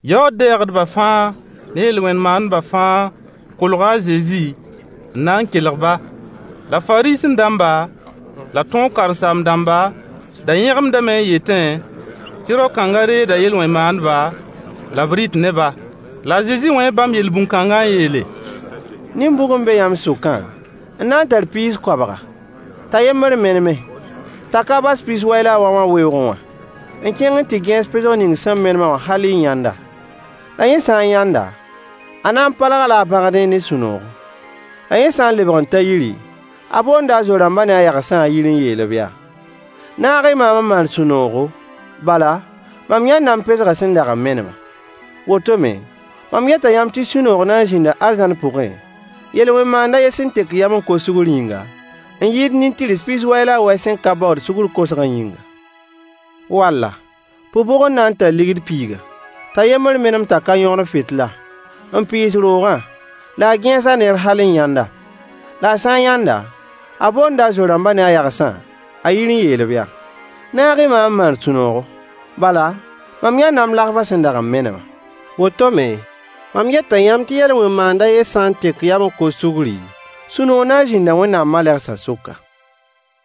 Yaood-dɛɛgdba fãa ne yel-wẽn maandba fãa kolga a Zezi n na n kelg-ba. La Fariisẽ-dãmba la tõog karen-saam-dãmba da yẽgemdame n yetẽ tɩ rao-kãnga reegda yel-wẽn mandba la b rɩt ne-ba. La a Zezi wẽe bãmb yel-bũn kãnga n yeele: Nin-bʋg n be yãmb sʋkã n na n tar piis koabga, t'a yembr meneme, t'a ka bas pis-wɛ la a wɛ wã weoogẽ wã n kẽng n tɩ gẽes pesg ning sẽn menem-a wã hal t'a yãnd-a? La yẽ sã n yãnd-a, a na n palg-a-la a bagdẽ ne sũ-noogo. La yẽ sã n lebg n ta yiri, a boonda a zo-rãmbã ne a yagsã a yir n yeel-b yaa: “Naag-y maam n maan sũ-noogo, bala, mam yãnda m pesgã sẽn dag n menemã.” Woto me, mam yeta yãmb tɩ sũ-noog na n zĩnda arzãn pʋgẽ, yel-wẽn maand a yen sẽn tek yam n kos sugr yĩnga, n yɩɩd nin-tɩrs pis-wɛ la a wɛ sẽn ka baood sugr kosgã yĩnga. Walla, pʋg bʋg n na n tar ligd piiga t'a yembr menem t'a ka yõgen fɩtla, n pɩɩs roogã la a gẽes-a neer hal n yãnd-a? La a sã n yãnd-a, a boonda a zo-rãmbã ne a yagsã a yir n yeel-b yaa: Naag-y maam n maan sũ-noogo, bala, mam yãnda m lagfã sẽn dag n menemã. Woto me, mam yeta yãmb tɩ yel-wẽn maand a yen sã n tek yam n kos sugri, sũ-noog na n zĩnda Wẽnnaam malegsã sʋka.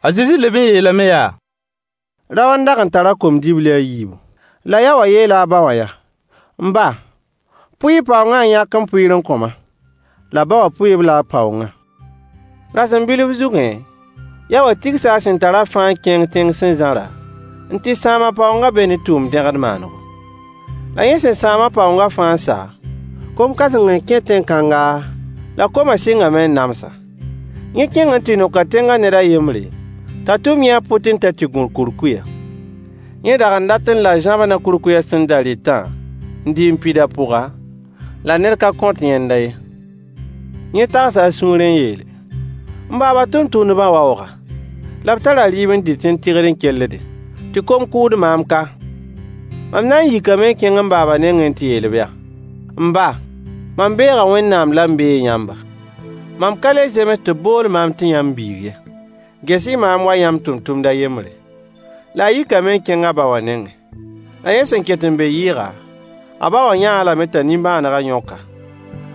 A Zezi leb n yeelame yaa: Rao n dag n tar kom-dibli a yiibu. La yaowã yeela a ba wã yaa: “M ba, pʋɩ-y y paoongã n yãk m pʋɩɩr n kõ-ma”. La ba wã pʋɩ-b-la a paoongã. Rasem bilf zugẽ, yaowã tigsa a sẽn da tarã fãa n kẽng tẽng sẽn zãra, n tɩ sãam a paoongã be ne tʋʋm-dẽgd maanego. La yẽ sẽn sãam a paoongã fãa n sa, kom kãseng n kẽ tẽn-kãnga, la koma sɩngame n nams-a. Yẽ kẽng n tɩ noka tẽnga ned a yembre, t'a tʋm yẽ a pʋtẽ t'a tɩ gũ kurkuyã. Yẽ dag n datẽ la zãbnã kurkuyã sẽn da rɩtã n dɩ n pid a pʋga, la ned ka kõt yẽnda ye. Yẽ tagsa a sũurẽ n yeele: “M baaba tʋmtʋmdbã waooga, la b tara rɩɩb n dɩt n tɩgd n kelldẽ, tɩ kom kʋʋd maam ka. Mam na n yikame n kẽng m baaba nengẽ n tɩ yeel-b yaa: M ba, mam beega Wẽnnaam la m beeg yãmba. Mam ka le zems tɩ b bool maam tɩ yãmb biig ye. Ges-y maam wa yãmb tʋmtʋmd a yembre.” La a yikame n kẽng a ba wã nengẽ. La yẽ sẽn ket n be yɩɩga, a ba wã yã-a lame t'a nimbãanega yõk-a.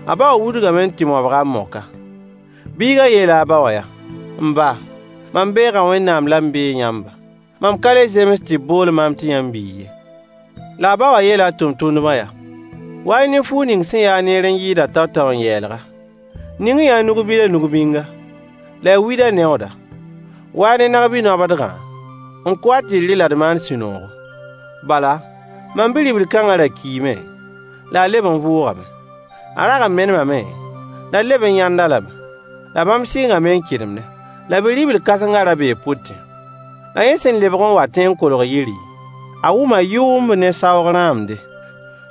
A ba wã wudgame n tɩ mobg-a n mok-a. Biigã yeela a ba wã yaa: “M ba, mam beega Wẽnnaam la m beeg yãmba. Mam ka le zems tɩ b bool maam tɩ y biig ye.” La a ba wã yeela a tʋmtʋmdbã yaa: “Wa-y ne fuug ning sẽn yaa-a neer n yɩɩdã tao-tao n yeelg-a. Ning-y-yã-a nug-bilã nugbĩnga, la y wĩd-a neooda. Wa-y ne nag-bi-noabdgã, n kʋ-a tɩ d rɩ la d maan sũ-noogo. Bala, mam bi-ribl kãnga ra kiime la a leb n vʋʋgame. A rag n menemame, la d leb n yãnd-a lame.” La bãmb sɩngame n kɩdemdẽ. La bi-ribl kãsengã ra bee pʋtẽ. La yẽ sẽn lebg n watẽ n kolg yiri, a wʋma yʋʋmb ne saoog rãamde.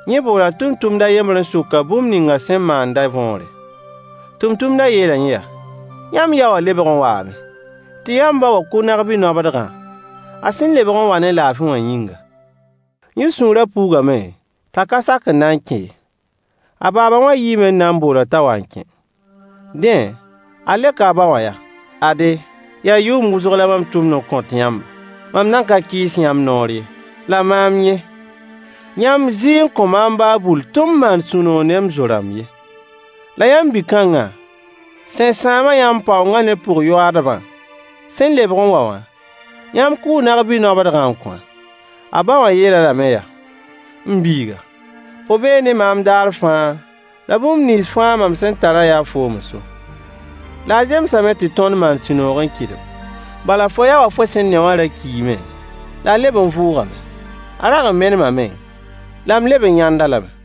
Yẽ boola tʋmtʋmd a yembr n sok-a bũmb ninga sẽn maandã võore. Tʋmtʋmdã yeela yẽ yaa: “Yãmb yaowã lebg n waame, tɩ yãmb ba wã kʋ nag-bi-noabdgã, a sẽn lebg n wa ne laafɩ wã yĩnga.” Yẽ sũurã puugame t'a ka sak n na n kẽ ye. A baaba wã yiime n na n bool-a t'a wa n kẽ. Dẽ, a leoka a ba wã yaa: “Ade, yaa yʋʋm wʋsg la mam tʋmd n kõt yãmba. Mam nan ka kɩɩs yãmb noor ye. La maam yẽ, yãmb zɩɩ n kõ maam baa bull tɩ m maan sũ-noog ne m zo-rãmb ye. La yãmb bi-kãnga, sẽn sãam-a yãmb paoongã ne pʋg-yoaadbã sẽn lebg n wa wã, yãmb kʋʋ nag-bi-noabdgã n kõ-a.” A ba wã yeel-a lame yaa: “M biiga, fo bee ne maam daar fãa, la bũmb nins fãa mam sẽn tarã yaa foom n so. La a zemsame tɩ tõnd maan sũ-noog n kɩdem. Bala fo yao wã fo sẽn ne wã ra kiime, la a leb n vʋʋgame. A rag n menemame, la m leb n yãnd-a lame.”